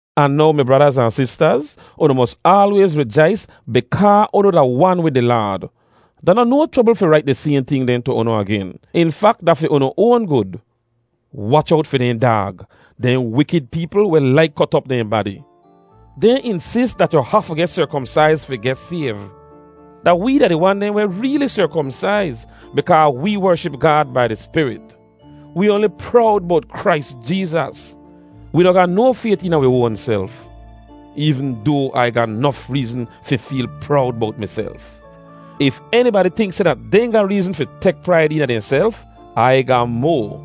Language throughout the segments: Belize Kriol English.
Ahn now mi bradaz ahn sistaz, unu mos aalwayz rijais bikaa unu da wan wid di Laad. Da noh no chrobl fi rait di sayhn ting dehn tu unu agen; in fak, da fi unu oan gud. Wach owt fi dehn daag—dehn wikid peepl weh laik kot op dehn badi. Dehn insis dat yu hafu geh serkomsaiz fi geh sayv. Da wee da di wan dehn weh reeli serkomsaiz bikaa wee wership Gaad bai di Spirit. Wee oanli prowd bowt Krais Jeezas. Wee noh ga no fayt eena wi oanself, eevn doa Ai ga nof reezn fi feel prowd bowt miself. If enibadi tink seh dat dehn ga reezn fi tek praid eena dehnself, Ai ga moa: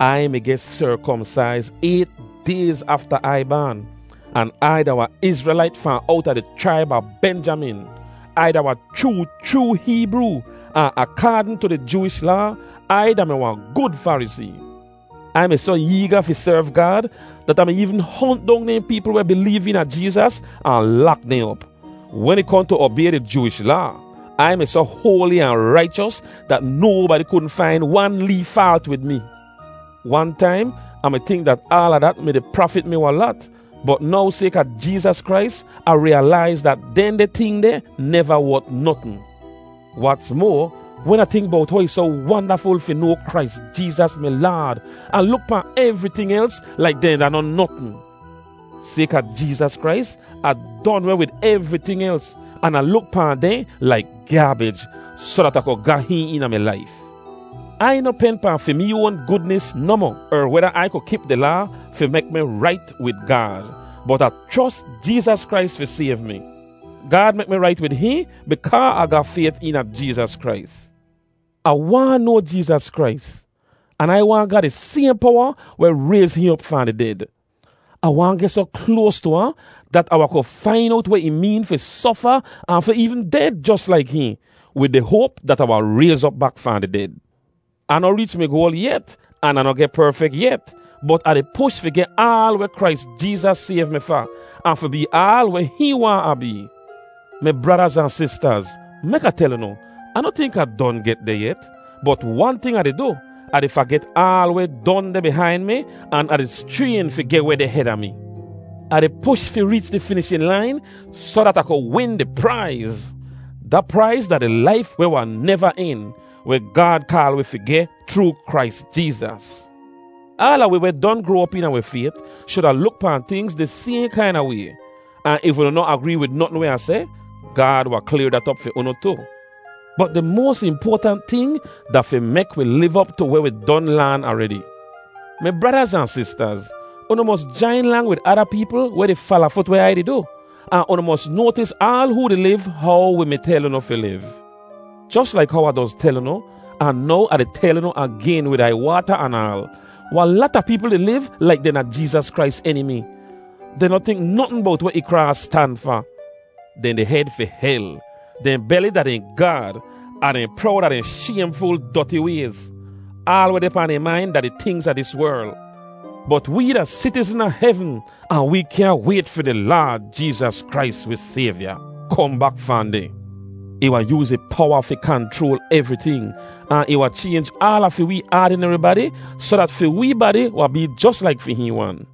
Ai mi geh serkomsaiz ayt dayz afta Ai baan, an Ai da wahn Izrelait fahn owta di chraib a Benjamin. Ai da wahn chroo chroo Heebroo, ahn akaadn tu di Jooish Laa, Ai da-mi wahn gud Farisee. Ai mi soh eega fi serv Gaad dat Ah mi eevn hont dong dehn peepl weh bileev eena Jeezas ahn lak dehn op. Wen ih kohn tu obay di Jooish Laa, Ai mi soh hoali ahn raichos dat nobadi kudn fain wan lee faalt wid mi. Wan taim, Ah mi tink dat aala dat mi-di prafit mi wahn lat, bot now sayka Jeezas Krais, Ah riyalaiz dat dehndeh ting deh neva wot notn. Wats moa, wen Ah tink bowt how ih soh wandaful fi noa Krais Jeezas mi Laad, Ah luk pahn evriting els laik dehn da noh notn. Sayka Jeezas Krais, Ah don weh wid evriting els, an Ah luk pahn dehn laik gyaabij soh dat Ah ku ga hihn eena mi laif. Ai noh pen pahn fi mee oan gudnis nohmoh, er weda Ai ku kip di Laa fi mek mi rait wid Gaad, bot Ah chros Jeezas Krais fi sayv mi. Gaad mek mi rait wid hihn bikaa Ah ga fayt eena Jeezas Krais. Ah waahn noa Jeezas Krais, an Ai waahn ga di sayhn powa weh rayz hihn op fahn di ded. Ah waahn geh soh kloas tu ahn dat Ah wahn ku fain owt weh ih meen fi sofa ahn fi eevn ded jos laik hihn, wid di hoap dat Ah wahn rayz op bak fahn di ded. Ah noh reech mi goal yet, an Ah noh geh perfek yet, bot Ah di push fi geh aal weh Krais Jeezas sayv mi fa, ahn fi bee aal weh hihn waahn Ah bee. Mi bradaz ahn sistaz, mek Ah tel unu, Ah noh tink Ah don get deh yet. Bot wan ting Ah di du: Ah di faget aal weh don deh bihain mi an Ah di schrayn fi geh weh deh heda mi. Ah di push fi reech di finishin lain soh dat Ah ku win di praiz. Da praiz da di laif weh wahn neva en, weh Gaad kaal wi fi geh chroo Krais Jeezas. Aala wi weh don groa op eena wi fayt shuda luk pahn tingz di sayhn kaina way. Ahn if unu noh agree wid notn weh Ah seh, Gaad wahn klayr dat op fi unu tu. Bot di moas impoatant ting da fi mek wi liv op tu weh wi don laan aredi. Mi bradaz ahn sistaz, unu mos jain lang wid ada peepl weh di falafut weh Ai di du, ahn unu mos noatis aal hoo di liv how wi mi tel unu fi liv. Jos laik how Ah doz tel unu, ahn now Ah di tel unu agen wid aiywaata anaal: wahn lata peepl di liv laik dehn da Jeezas Krais enimi. Dehn noh tink notn bowt weh ih kraas stan fa. Dehn di hed fi hel; dehn beli da dehn gaad, ahn dehn prowd a dehn shaymful, doti wayz. Aal weh deh pahn dehn main da di tingz a dis werl. Bot wee da sitizn a hevn, ahn wi kyaahn wayt fi di Laad Jeezas Krais, wi Sayvya, kohn bak fahn deh. Ih wahn yooz ih powa fi kanchroal evriting, ahn ih wahn chaynj aala fi wee aadineri badi soh dat fi wee badi wahn bee jos laik fi hihn wan.